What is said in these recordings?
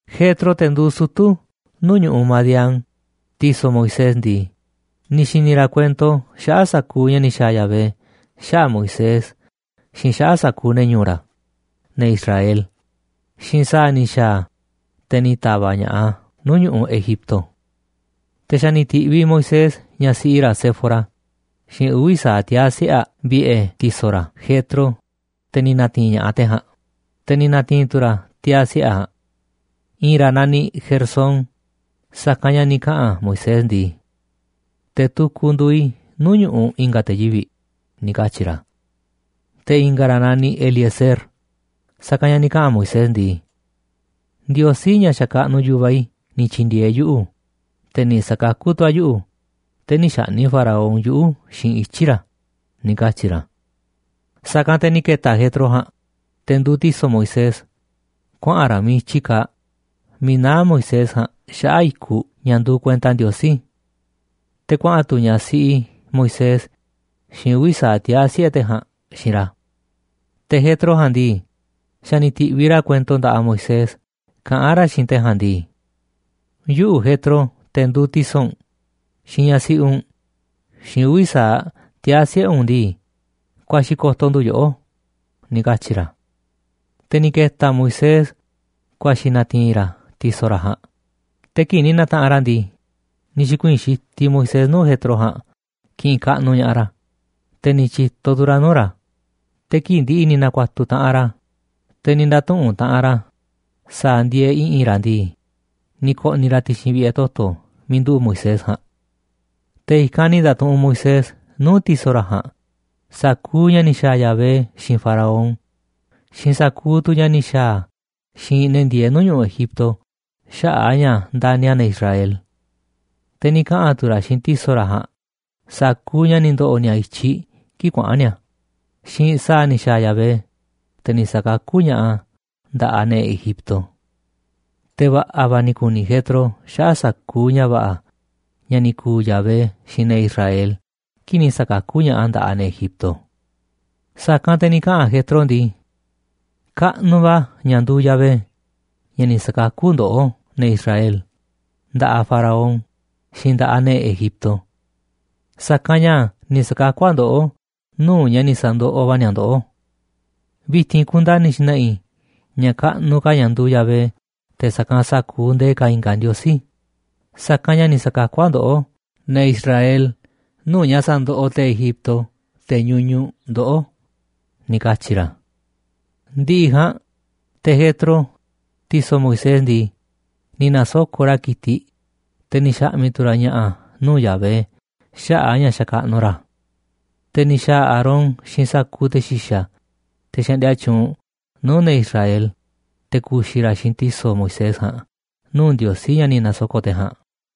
Jetro, te̱ nduuꞌ sutu̱ nuu̱ꞌ ñu̱ꞌuꞌ Madián, ti̱so̱ Moisés ndii, ni̱ xi̱ni̱ ra̱ kuento xaꞌa̱ꞌ sa̱kuuꞌ ña̱ ni̱ xa̱a̱ Yahvé xaꞌa̱ꞌ Moisés xiinꞌ xaꞌa̱ꞌ sa̱kuuꞌ ne̱ ñu̱u̱ ra̱, ne̱ Israel, xiinꞌ sa̱a̱ ni̱ xa̱a̱ a̱, te̱ ni̱ ta̱va̱ꞌ ña̱ꞌaꞌ a̱ nuu̱ꞌ ñu̱ꞌuꞌ Egipto. Te̱ xa̱ ni̱ ti̱ꞌviꞌ Moisés ñaꞌ siꞌi ra̱ Séfora xiinꞌ uvi̱ sa̱aꞌ tiaa̱ siꞌe̱ aꞌ vi̱ꞌe̱ ti̱so̱ ra̱ Jetro, te̱ ni̱ na̱ti̱i̱n ña̱ꞌaꞌ te̱ ja̱a̱nꞌ. Te̱ ni̱ na̱ti̱i̱n tu̱ ra̱ tiaa̱ siꞌe̱ aꞌ ja̱a̱nꞌ. I̱i̱n ra̱ naniꞌ Gersón, sa̱kanꞌ ña̱ ni̱ kaꞌa̱n Moisés ndii: “Te̱ tukuꞌ nduuꞌ i̱ nuu̱ꞌ ñu̱ꞌuꞌ i̱nga̱ te̱ yivi̱ꞌ,” ni̱ katyi̱ ra̱. Te̱ i̱nga̱ ra̱ naniꞌ Eliezer, sa̱kanꞌ ña̱ ni̱ kaꞌa̱n Moisés ndii: “Ndiosí, ña̱ xakaꞌnuꞌ yu̱vaꞌ i̱, ni̱ tyi̱ndi̱e̱eꞌ yuꞌu̱, te̱ ni̱ sa̱kakú tu̱ a̱ yuꞌu̱, te̱ nï̱ xa̱ꞌni̱ꞌ Faraón yuꞌu̱ xiinꞌ ityi̱ ra̱,” ni̱ katyi̱ ra̱. Sa̱kanꞌ te̱ ni̱ ke̱ta̱ Jetro ja̱a̱nꞌ, te̱ nduuꞌ ti̱so̱ Moisés, kuaꞌa̱n ra̱ miiꞌ i̱tyi kaaꞌ, miiꞌ naá Moisés ja̱a̱nꞌ xaꞌa̱ꞌ i̱kuꞌ ña̱ nduuꞌ kuenta Ndiosí. Te̱ kuaꞌa̱n tu̱ ñaꞌ siꞌi Moisés xiinꞌ uvi̱ sa̱aꞌ tiaa̱ siꞌe̱ te̱ ja̱a̱nꞌ xiinꞌ ra̱. Te̱ Jetro ja̱a̱nꞌ ndii, xa̱ ni̱ ti̱ꞌviꞌ ra̱ kuento nda̱ꞌaꞌ Moisés kaꞌán ra̱ xiinꞌ te̱ ja̱a̱nꞌ ndii: “Yuꞌu̱, Jetro, te̱ nduuꞌ ti̱so̱ u̱nꞌ, xiinꞌ ñaꞌ siꞌi u̱nꞌ, xiinꞌ uvi̱ sa̱aꞌ tiaa̱ siꞌe̱ u̱nꞌ ndii, ku̱a̱xi̱ ko̱to̱ ndu̱ yoꞌó,” ni̱ katyi̱ ra̱. Te̱ ni̱ ke̱ta̱ Moisés ku̱a̱xi̱ na̱ti̱i̱n ra̱ ti̱so̱ ra̱ ja̱a̱nꞌ, te̱ kii̱ꞌ ni̱ na̱taꞌanꞌ ra̱ ndii, ni̱ xi̱kuii̱n xitiꞌ Moisés nuu̱ꞌ Jetro ja̱a̱nꞌ kiꞌinꞌ kaꞌnuꞌ ña̱ꞌaꞌ ra̱, te̱ ni̱ tyi̱to tu̱ ra̱ nuu̱ꞌ ra̱, te̱ kii̱ꞌ ndi̱ꞌi̱ ni̱ na̱ku̱a̱tu̱ taꞌanꞌ ra̱, te̱ ni̱ nda̱tuꞌu̱nꞌ taꞌanꞌ ra̱ sa̱a̱ ndieeꞌ i̱ꞌi̱n ra̱ ndii, ni̱ ko̱ꞌni̱ ra̱ ti̱xi̱n vi̱ꞌe̱ toto̱ miiꞌ nduꞌu̱ꞌ Moisés ja̱a̱nꞌ. Te̱ i̱kanꞌ ni̱ nda̱tuꞌunꞌ Moisés nuu̱ꞌ ti̱so̱ ra̱ ja̱a̱nꞌ sa̱kuuꞌ ña̱ ni̱ xa̱a̱ Yahvé xiinꞌ Faraón xiinꞌ sa̱kuuꞌ tu̱ ña̱ ni̱ xa̱a̱ a̱ xiinꞌ ne̱ ndieeꞌ nuu̱ꞌ ñu̱ꞌuꞌ Egipto xaꞌa̱ꞌ a̱ ña̱ ndani̱ a̱ ne̱ Israel. Te̱ ni̱ kaꞌa̱n tu̱ ra̱ xiinꞌ ti̱so̱ ra̱ ja̱a̱nꞌ sa̱kuuꞌ ña̱ ni̱ ndo̱ꞌo̱ ni̱a̱ i̱tyiꞌ kii̱ꞌ kuaꞌa̱n ni̱a̱ xiinꞌ sa̱a̱ ni̱ xa̱a̱ Yahvé, te̱ ni̱ sa̱kakú ña̱ꞌaꞌ a̱ nda̱ꞌaꞌ ne̱ Egipto. Te̱ va̱ꞌa̱ va̱ ni̱ ku̱ni̱ Jetro xaꞌa̱ꞌ sa̱kuuꞌ ña̱ va̱ꞌa̱ ña̱ ni̱ ku̱u̱ Yahvé xiinꞌ ne̱ Israel kii̱ꞌ ni̱ sa̱kakú ña̱ꞌaꞌ a̱ nda̱ꞌaꞌ ne̱ Egipto. Sa̱kanꞌ te̱ ni̱ kaꞌa̱n Jetro ndii: ―Kaꞌnuꞌ va̱ ña̱ nduuꞌ Yahvé, ña̱ ni̱ sa̱kakú ndoꞌó, ne̱ Israel, nda̱ꞌaꞌ Faraón xiinꞌ nda̱ꞌaꞌ ne̱ Egipto. Sa̱kanꞌ ña̱ ni̱ sa̱kakú a̱ ndoꞌó nuu̱ꞌ ña̱ ni̱ sa̱ndoꞌoꞌ va̱ ni̱a̱ ndoꞌó. Vi̱ti̱n kundani̱ i̱ xna̱ꞌa̱ i̱ ña̱ kaꞌnuꞌ ka̱ ña̱ nduuꞌ Yahvé te̱ sa̱kanꞌ sa̱kuuꞌ ndee ka̱ i̱nga̱ ndiosí, sa̱kanꞌ ña̱ ni̱ sa̱kakú a̱ ndoꞌó, ne̱ Israel, nuu̱ꞌ ña̱ sandoꞌoꞌ te̱ Egipto, te̱ ñuñuꞌ, ndoꞌó ―ni̱ katyi̱ ra̱. Ndi̱ꞌi̱ ja̱a̱nꞌ te̱ Jetro, ti̱so̱ Moisés ndii, ni̱ na̱soko̱ꞌ ra̱ ki̱tiꞌ, te̱ ni̱ xa̱ꞌmi̱ tu̱ ra̱ ña̱ꞌa̱ nuu̱ꞌ Yahvé xaꞌa̱ꞌ a̱ ña̱ xakaꞌnuꞌ ra̱ a̱. Te̱ ni̱ xa̱a̱ Aarón xiinꞌ sa̱kuuꞌ te̱ xi̱xa̱, te̱ xaꞌndia tyuunꞌ nuu̱ꞌ ne̱ Israel, te̱ ku̱xi̱ ra̱ xiinꞌ ti̱so̱ Moisés ja̱a̱nꞌ nuu̱ꞌ Ndiosí ña̱ ni̱ na̱soko̱ꞌ te̱ ja̱a̱nꞌ.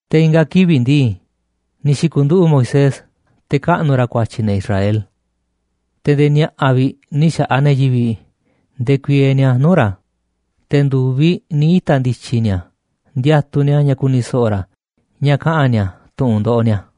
Te̱ i̱nga̱ kivi̱ꞌ ndii, ni̱ xi̱ku̱nduꞌu̱ꞌ Moisés te̱ kaꞌnu̱ ra̱ ku̱a̱tyi̱ ne̱ Israel. Te̱ nde̱e̱ ni̱a̱ꞌa̱ vi̱ꞌ ni̱ xa̱ꞌaꞌ ne̱ yivi̱ꞌ ndekuieeꞌ ni̱a̱ nuu̱ꞌ ra̱, te̱ ndu̱viꞌ ni̱ ita̱ ndi̱tyi̱ ni̱a̱ ndiatuꞌ ni̱a̱ ña̱ ku̱ni̱ so̱ꞌo̱ ra̱ ña̱ kaꞌa̱n ni̱a̱ tu̱ꞌu̱n ndoꞌoꞌ ni̱a̱.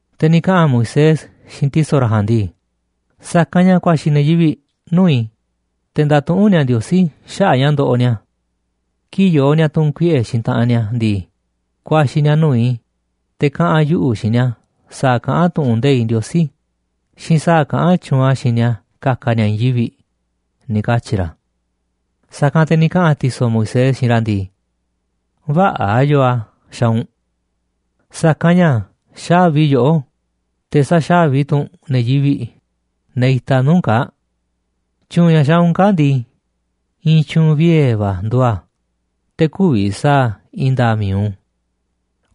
Te̱ ni̱ kaꞌa̱n Moisés xiinꞌ ti̱so̱ ra̱ ja̱a̱nꞌ ndii: ―Sa̱kanꞌ ña̱ ku̱a̱xi̱ ne̱ yivi̱ꞌ nuu̱ꞌ i̱ te̱ ndatuꞌúnꞌ ni̱a̱ Ndiosí xaꞌa̱ꞌ ña̱ ndoꞌoꞌ ni̱a̱. Kii̱ꞌ yoo ni̱a̱ tu̱n kuiꞌe̱ xiinꞌ taꞌanꞌ ni̱a̱ ndii, ku̱a̱xi̱ ni̱a̱ nuu̱ꞌ i̱, te̱ kaꞌa̱n yuꞌu̱ xiinꞌ ni̱a̱ sa̱a̱ kaꞌán tu̱ꞌu̱n nde̱iꞌ Ndiosí xiinꞌ sa̱a̱ kaꞌán tyuunꞌ a̱ xiinꞌ ni̱a̱ ka̱ka̱ ni̱a̱ i̱i̱n yivi̱ꞌ —ni̱ katyi̱ ra̱. Sa̱kanꞌ te̱ ni̱ kaꞌa̱n ti̱so̱ Moisés xiinꞌ ra̱ ndii: ―Vä̱ꞌa̱ yoo a̱ xaaꞌ u̱nꞌ. Sa̱kanꞌ ña̱ xávi yoꞌó, te̱ saxa̱vi tu̱ u̱nꞌ ne̱ yivi̱ꞌ, ne̱ itaꞌ nuu̱ꞌ u̱nꞌ kaa̱ꞌ. Tyu̱u̱n ña̱ xaaꞌ u̱nꞌ kaa̱ꞌ ndii, i̱i̱n tyu̱u̱n vie̱ va̱ nduuꞌ a̱, te̱ kü̱vi̱ sa̱a̱ i̱i̱n nda̱a̱ꞌ mi̱iꞌ u̱nꞌ.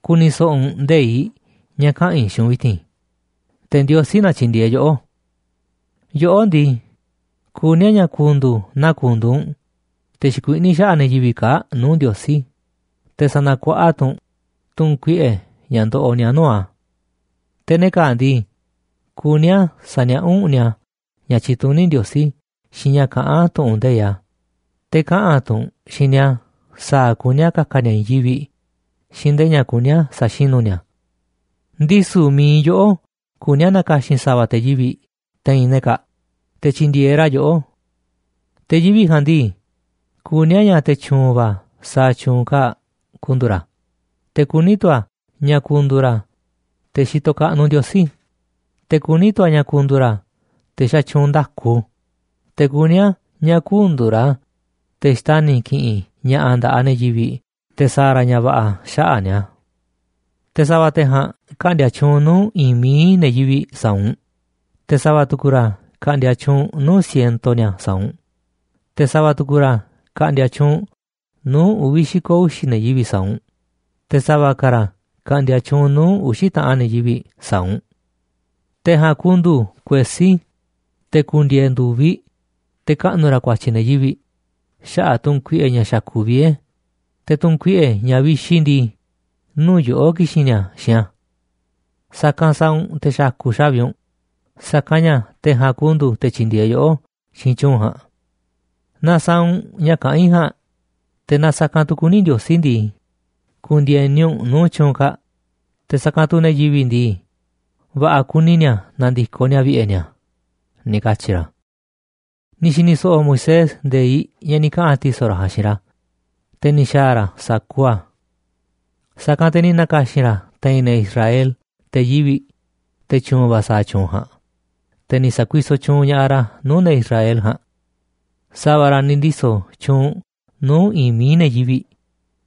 Ku̱ni̱ so̱ꞌo̱ u̱nꞌ nde̱iꞌ ña̱ kaꞌa̱n i̱ xiinꞌ u̱nꞌ vi̱ti̱n, te̱ Ndiosí na tyi̱ndi̱e̱eꞌ yoꞌó. Yoꞌó ndii, kuní a̱ ña̱ ku̱ndu̱u̱ naa ku̱ndu̱u̱ u̱nꞌ te̱ xikuiꞌní xaꞌa̱ꞌ ne̱ yivi̱ꞌ kaa̱ꞌ nuu̱ꞌ Ndiosí, te̱ sa̱na̱ku̱a̱ꞌa̱ tu̱ u̱nꞌ tu̱nkuiꞌe̱ ña̱ ndoꞌoꞌ ni̱a̱ nuu̱ꞌ a̱. Te̱ ne̱ kaa̱ꞌ ndii, kuní a̱ sa̱niaꞌá u̱nꞌ ni̱a̱ ña̱ tyituní Ndiosí xiinꞌ ña̱ kaꞌán tu̱ꞌu̱n nde̱iꞌ a̱, te̱ kaꞌa̱n tu̱ u̱nꞌ xiinꞌ ni̱a̱ sa̱a̱ kuní a̱ ka̱ka̱ ni̱a̱ i̱i̱n yivi̱ꞌ xiinꞌ ndee ña̱ kuní a̱ sa̱xinu̱ ni̱a̱. Ndisu̱ mi̱iꞌ yoꞌó kuní a̱ na̱ka̱xi̱n sa̱va̱ te̱ yivi̱ꞌ te̱i̱n ne̱ kaa̱ꞌ, te̱ tyi̱ndi̱e̱eꞌ ra̱ yoꞌó. Te̱ yivi̱ꞌ ja̱a̱nꞌ ndii, kuní a̱ ña̱ te̱ tyu̱u̱n va̱ sa̱a̱ tyu̱u̱n kaa̱ꞌ ku̱ndu̱u̱ ra̱, te̱ kuní tu̱ a̱ ña̱ ku̱ndu̱u̱ ra̱ te̱ xitoꞌ kaꞌnuꞌ Ndiosí, te̱ kuní tu̱ a̱ ña̱ ku̱ndu̱u̱ ra̱ te̱ xatyuunꞌ nda̱ku, te̱ kuní a̱ ña̱ kü̱ndu̱u̱ ra̱ te̱ xtani̱ ki̱ꞌi̱n ña̱ꞌa̱ nda̱ꞌaꞌ ne̱ yivi̱ꞌ te̱ sa̱a̱ ra̱ ña̱ va̱ꞌa̱ xaꞌa̱ꞌ ni̱a̱. Te̱ sa̱va̱ te̱ ja̱a̱nꞌ ka̱ꞌndi̱a̱ tyuunꞌ nuu̱ꞌ i̱i̱n mií ne̱ yivi̱ꞌ sa̱a̱ u̱nꞌ, te̱ sa̱va̱ tu̱ku̱ ra̱ ka̱ꞌndi̱a̱ tyuunꞌ nuu̱ꞌ siento ni̱a̱ sa̱a̱ u̱nꞌ, te̱ sa̱va̱ tu̱ku̱ ra̱ ka̱ꞌndi̱a̱ tyuunꞌ nuu̱ꞌ uvi̱ xi̱ko̱ uxi̱ ne̱ yivi̱ꞌ sa̱a̱ u̱nꞌ, te̱ sa̱va̱ ka̱ ra̱ ka̱ꞌndi̱a̱ tyuunꞌ nuu̱ꞌ uxi̱ taꞌan ne̱ yivi̱ꞌ sa̱a̱ u̱nꞌ. Te̱ ja̱a̱nꞌ ku̱ndu̱u̱ kuesí, te̱ ku̱ndi̱e̱e̱ ndu̱viꞌ te̱ kaꞌnu̱ ra̱ ku̱a̱tyi̱ ne̱ yivi̱ꞌ xaꞌa̱ꞌ tu̱nkuiꞌe̱ ña̱ xa̱ku̱ꞌ vie̱, te̱ tu̱nkuiꞌe̱ ña̱ vixi ndii, nuu̱ꞌ yoꞌó ki̱xi̱n ni̱a̱ xiinꞌ a̱. Sa̱kanꞌ sa̱a̱ u̱nꞌ te̱ xa̱ku̱ꞌ xa̱vi u̱nꞌ, sa̱kanꞌ ña̱ te̱ ja̱a̱nꞌ ku̱ndu̱u̱ te̱ tyi̱ndi̱e̱eꞌ yoꞌó xiinꞌ tyu̱u̱n ja̱a̱nꞌ. Naaꞌ sa̱a̱ u̱nꞌ ña̱ kaꞌán i̱ ja̱a̱nꞌ, te̱ naaꞌ sa̱kanꞌ tu̱ kuní Ndiosí ndii, ku̱ndi̱e̱ni u̱nꞌ nuu̱ꞌ tyu̱u̱n kaa̱ꞌ, te̱ sa̱kanꞌ tu̱ ne̱ yivi̱ꞌ ndii, va̱ꞌa̱ kuni ni̱a̱ na̱ndi̱koꞌ ni̱a̱ vi̱ꞌe̱ ni̱a̱ ―ni̱ katyi̱ ra̱. Ni̱ xi̱ni̱ so̱ꞌo̱ Moisés nde̱iꞌ ña̱ ni̱ kaꞌa̱n ti̱so̱ ra̱ ja̱a̱nꞌ xiinꞌ ra̱, te̱ ni̱ xa̱a̱ ra̱ sa̱kuuꞌ a̱. Sa̱kanꞌ te̱ ni̱ na̱ka̱xi̱n ra̱ te̱i̱n te̱ Israel te̱ yivi̱ꞌ, te̱ tyu̱u̱n va̱ sa̱a̱ tyu̱u̱n ja̱a̱nꞌ, te̱ ni̱ sa̱kuisoꞌ tyuunꞌ ña̱ꞌaꞌ ra̱ nuu̱ꞌ ne̱ Israel ja̱a̱nꞌ. Sa̱va̱ ra̱ ni̱ ndiso̱ tyuunꞌ nuu̱ꞌ i̱i̱n mií ne̱ yivi̱ꞌ,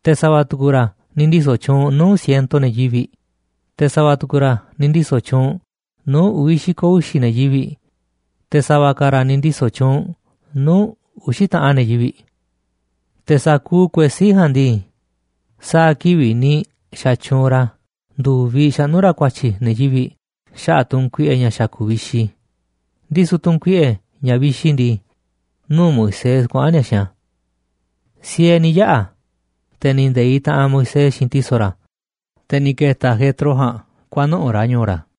te̱ sa̱va̱ tu̱ku̱ ra̱ ni̱ ndiso̱ tyuunꞌ nuu̱ꞌ siento ne̱ yivi̱ꞌ, te̱ sa̱va̱ tu̱ku̱ ra̱ ni̱ ndiso̱ tyuunꞌ nuu̱ꞌ uvi̱ xi̱ko̱ uxi̱ ne̱ yivi̱ꞌ, te̱ sa̱va̱ ka̱ ra̱ ni̱ ndiso̱ tyuunꞌ nuu̱ꞌ uxi̱ taꞌan ne̱ yivi̱ꞌ. Te̱ sa̱kuuꞌ kuesí ja̱a̱nꞌ ndii, sa̱a̱ kivi̱ꞌ ni̱ xa̱tyuunꞌ ra̱ ndu̱viꞌ xaꞌnú ra̱ ku̱a̱tyi̱ ne̱ yivi̱ꞌ xaꞌa̱ꞌ tu̱nkuiꞌe̱ ña̱ xa̱ku̱ꞌ vixi, ndisu̱ tu̱nkuiꞌe̱, ña̱ vixi ndii, nuu̱ꞌ Moisés kuaꞌa̱n ni̱a̱ xiinꞌ a̱. Siee ni̱ yaꞌa̱, te̱ ni̱ nde̱iꞌ taꞌanꞌ Moisés xiinꞌ ti̱so̱ ra̱, te̱ ni̱ ke̱ta̱ te̱ Jetro ja̱a̱nꞌ kuanuꞌu̱ꞌ ra̱ ñu̱u̱ ra̱.